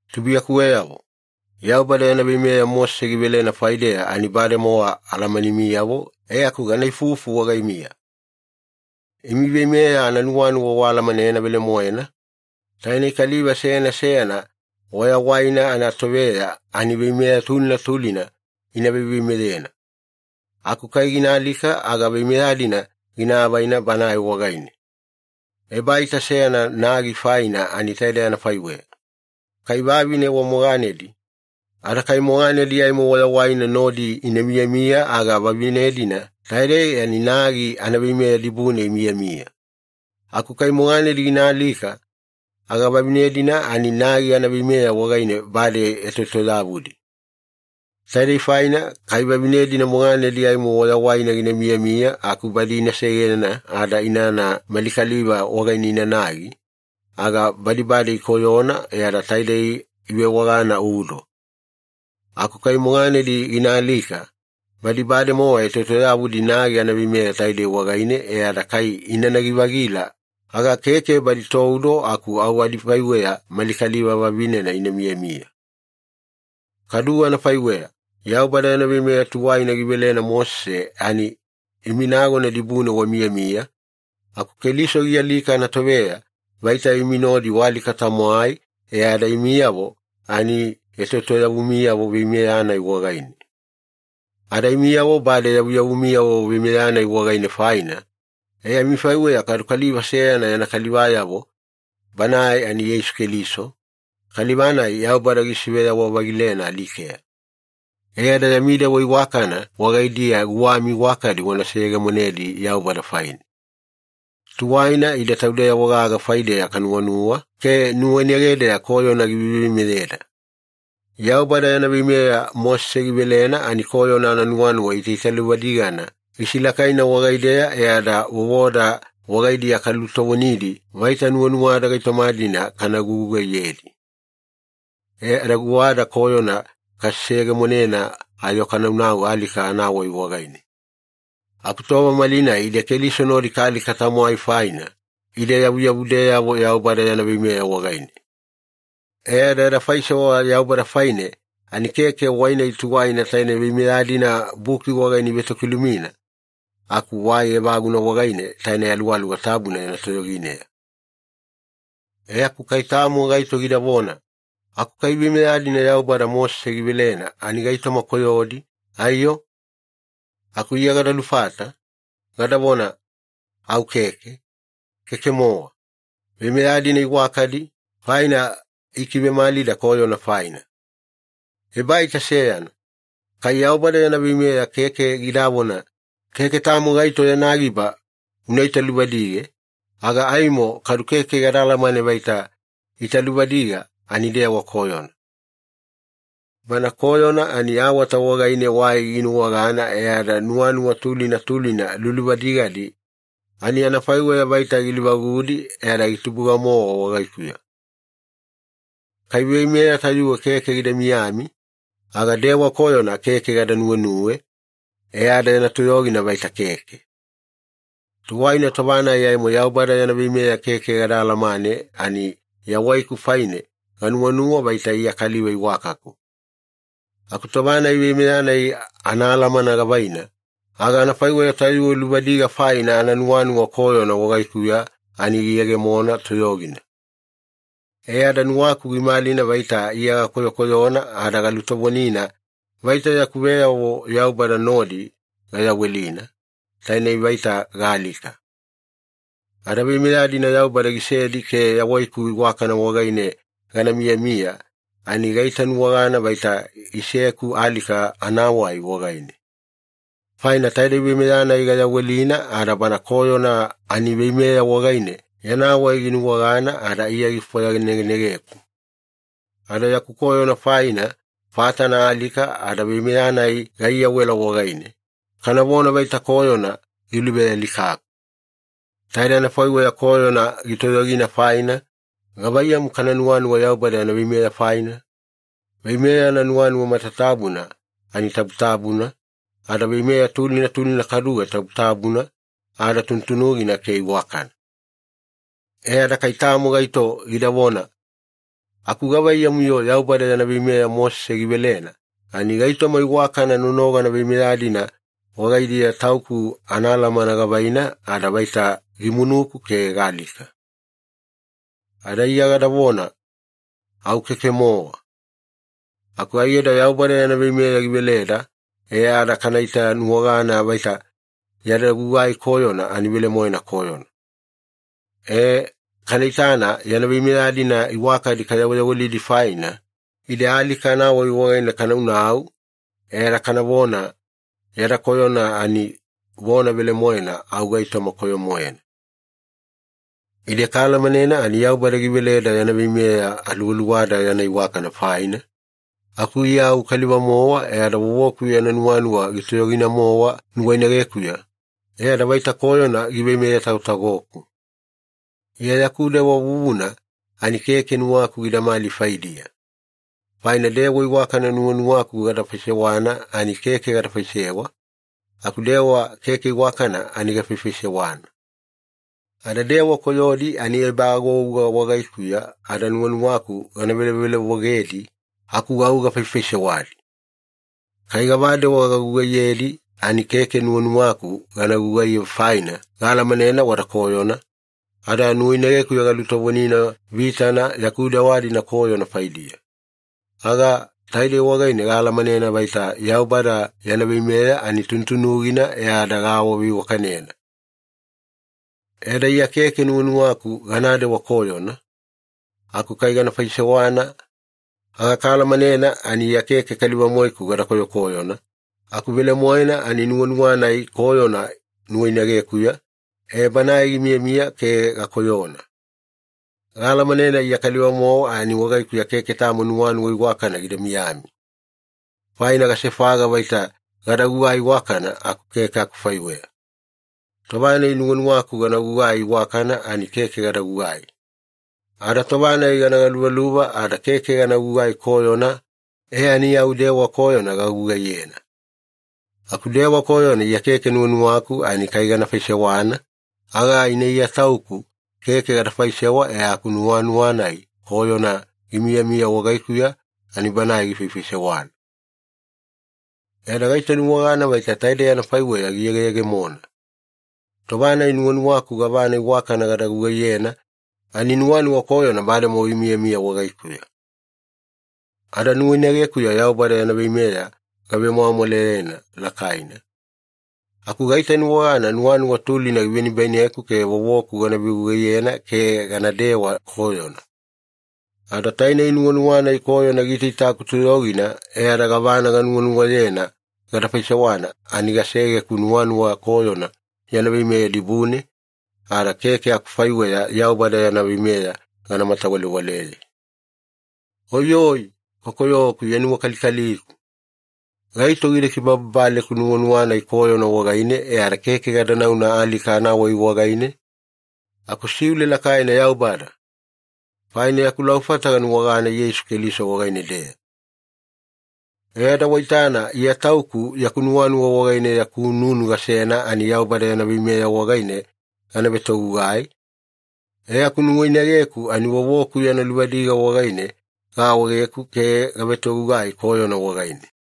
Tubuiyakuweyavo, Yaubada yana veimeya Mosese givelena faideya ani bademowa alamanimiyavo, e aku gana ifufu wagaimiya. Imi veimeya ananuwanuwa waalamanena velemoena, tainei kaliva seyana seyana wayawaina anatoveya ani veimeya tulina tulina ina veiveimeyena. Aku kai gina alika aga veimeya-dina gina avaina banae wagaine. Ebaita seyana nagi faina ani taidei anafaiweya. Kai vavine wa moganedi ada kai moganedi aimo wayawaina nodi ina miyamiya, aga vavinena-dina taidei ani nagi anaveimeya dibune imiyamiya. Aku kai moganedi gina alika, aga vavine-dina ani nagi anaveimeya wagaine bade etoetoyavudi. Taidei faina kai vavine-dina moganedi aimo wayawaina gina miyamiya aku badi ina segena ada inana mali kaliva wagaine inanagi, aga badi bade ikoyona ada taidei ivewagana udo. Aku kai moganedi gina alika, badi bademowa etoetoyavudi nagi anaveimeya taidei wagaine e ada kai inanagi-vagila, aga keke badi toudo aku au adifaiweya mali kaliva vavinena ina miyamiya. Kaduwe anafaiweya, Yaubada yana veimeya tuwaina givelena Mosese ani imi nagona dibune wamiyamiya, aku Keliso gialika anatoveya vaita imi nodi waalika-tamwai, e ada imiyavo ani etoetoyavumiyavo veimeya-nai wagaine. Ada imiyavo bade yavuyavumiyavo veimeya-nai wagaine faina, e amifaiweya kadu kaliva seyana yana kalivayavo, Banae ani Yeisu Keliso, kaliva-nai Yaubada gisiveyawa-vagilena alikeya. E ada yami dewa iwakana wagaidiya guwami iwakadi wana seyegemonedi Yaubada faine. Tuwaina ide taudeyavo gaga faideya kanuwanuwa ke nuwainagedeya koyona giveiveimeyeda. Yaubada yana veimeya Mosese givelena ani koyona ananuwanuwa itaitaluvadigana gisilakaina wagaideya, e ada vovoda wagaidiya kalulutovonidi vaita nuwanuwada gaitoma-dina kana gugugaiyedi. E ada guwada koyona kaseyegemonena ayo kanaunau alika anawai wagaine. Aku tova malinai ide Keliso nodi kaalika-tamwai faina, ide yavuyavudeyavo Yaubada yana veimeya wagaine. E ada yada faisewa Yaubada faine ani keke wai-nai tuwaina taine veimeya-dina buki wagaine ivetokilumina, aku wai evaguna wagaine taine Aluwaluwa Tabuna yana toyogineya. E aku kai tamo gaito gidavona, “Aku kai veimeya-dina Yaubada Mosese givelena ani gaitoma koyodi, aiyo?” Aku Iya gada lufata, gadavona, “Au keke, keke-mowa. Veimeya-dina iwakadi, faina ikivemalida koyona faina. Ebaita seyana, kai Yaubada yana veimeya keke gidavona, ‘Keke tamo gaito yana giba una italuvadige,’ aga aimo kadu keke gada alamane vaita italuvadiga ani dewa koyona. Bana koyona ani awata wagaine wai ginuwagana e ada nuwanuwa tulina tulina luluvadigadi ani anafaiweya vaita gilivagudi e ada gitubuga-mowa wagaikuya. Kai veimeya tayuwe keke gida miyami, aga dewa koyona keke gada nuwenuwe, e ada yana toyogina vaita keke. Tuwaina tova-nai aimo Yaubada yana veimeya keke gada alamane ani yawaiku faine ganuwanuwa vaita Iya kaliva iwakaku. Aku tova-nai veimeya-nai anaalamana gavaina, aga anafaiweya tayuwe luvadiga faina ananuwanuwa koyona wagaikuya ani giyegemona toyogina. E ada nuwaku gimalina vaita Iya gakoyokoyona ada galutovonina vaita yaku veyavo Yaubada nodi gayawelina, tainei vaita gaalika. Ada veimeya-dina Yaubada gisedi ke yawaiku iwakana wagaine gana miyamiya, ani gaitanuwagana vaita iseku alika anawai wagaine. Faina taidei veimeya-nai gayawelina, ada bana koyona ani veimeya wagaine yana wai ginuwagana ada Iya gifwayanegenegeku, ada yaku koyona faina fatana alika ada veimeya-nai gaiyawela wagaine, kanavona vaita koyona giluvealikaku. Taidei anafaiweya koyona gitoyogina faina, gavaiyamu kana nuwanuwa Yaubada yana veimeya faina? Veimeya ananuwanuwa matatabuna ani tabutabuna, ada veimeya tulina tulina kaduwe tabutabuna ada tunutunugina ke iwakana.” E ada kai tamo gaito gidavona, “Aku gavaiyamu-yo Yaubada yana veimeya Mosese givelena ani gaitoma iwakana nonogana veimeya-dina wagaidiya tauku anaalamana gavaina ada vaita gimunuku ke gaalika.” Ada Iya gadavona, “Au keke-mowa. Aku aiyada Yaubada yana veimeya giveleda e ada kana itanuwagana vaita yada gugai koyona ani velemoena koyona. E, kana itana yana veimeya-dina iwakadi kayaweyawelidi faina, ide alika anawai wagaine kanaunau, e ada kanavona, ‘Yada koyona ani vona velemoena au gaitoma koyo-moena.’” Ide kaalamanena ani Yaubada giveleda yana veimeya aluwaluwada yana iwakana faina, aku Iya au kaliva-mowa e ada vovoku yana nuwanuwa gitoyogina-mowa nuwainagekuya, e ada vaita koyona giveimeye-tagotagoku. Iya yaku dewa vuvuna ani keke nuwaku gidamali faidiya. Faina dewa iwakana nuwanuwaku gada faisewana ani keke gada faisewa, aku dewa keke iwakana ani gafaifaisewana. Ada dewa koyodi ani ebaagouga wagaikuya ada nuwanuwaku gana velovelovogedi, aku au gafaifaisewadi. Kai gavadewa gagugaiyedi ani keke nuwanuwaku gana gugaiye faina gaalamanena wada koyona, ada nuwainagekuya galutovonina vitana yaku dewa-dina koyona faidiya, aga taidei wagaine gaalamanena vaita Yaubada yana veimeya ani tunutunugina e ada gaawaveiwakanena. E ada Iya keke nuwanuwaku ganadewa koyona, aku kai gana faisewana, aga kana alamanena ani Iya keke kaliva-moeku gada koyokoyona, aku velemoena ani nuwanuwa-nai koyona nuwainagekuya, e banae gimiyamiya ke gakoyona. Gaalamanena Iya kaliva-mowa ani wagaikuya keke tamo nuwanuwa iwakana gida miyami. Faina gasefaga vaita gada gugai iwakana, aku keke akufaiweya. Tova-nai nuwanuwaku gana gugai iwakana ani keke gada gugai. Ada tova-nai gana galuvaluva ada keke gana gugai koyona, e ani au dewa koyona gagugaiyena. Aku dewa koyona Iya keke nuwanuwaku ani kai gana faisewana, aga ina Iya tauku keke gada faisewa e aku nuwanuwa-nai koyona gimiyamiya wagaikuya ani banae gifaifaisewana. E ada gaitanuwagana vaita taidei anafaiweya giyegeyegemona. Tova-nai nuwanuwaku gavana iwakana gada gugaiyena ani nuwanuwa koyona bademowa gimiyamiya wagaikuya. Ada nuwainagekuya Yaubada yana veimeya gavemwamwalayena lakaina, aku gaitanuwagana nuwanuwa tulina givenibaineku ke vovoku gana vegugaiyena ke ganadewa koyona. Ada tainei nuwanuwa-nai koyona gitaitaiku toyogina, e ada gavana ganuwanuwayena gada faisewana ani giseku nuwanuwa koyona yana veimeya dibune, ada keke akufaiweya Yaubada yana veimeya gana matawalewaleye. Oiyoi, kokoyoku Iya nuwakalikaliku! Gaito gida kibababaleku nuwanuwa-nai koyona wagaine e ada keke gada nauna alika anawai wagaine? Aku siule lakaina, Yaubada! Faina yaku laufata ganuwagana Yeisu Keliso wagaine-deya. E ada waitana, Iya tauku yaku nuwanuwa wagaine yaku nunu gasena ani Yaubada yana veimeya wagaine gana vetogugai, e aku nuwainageku ani vovoku yana luvadiga wagaine gaawaegeku ke gavetogugai koyona wagaine.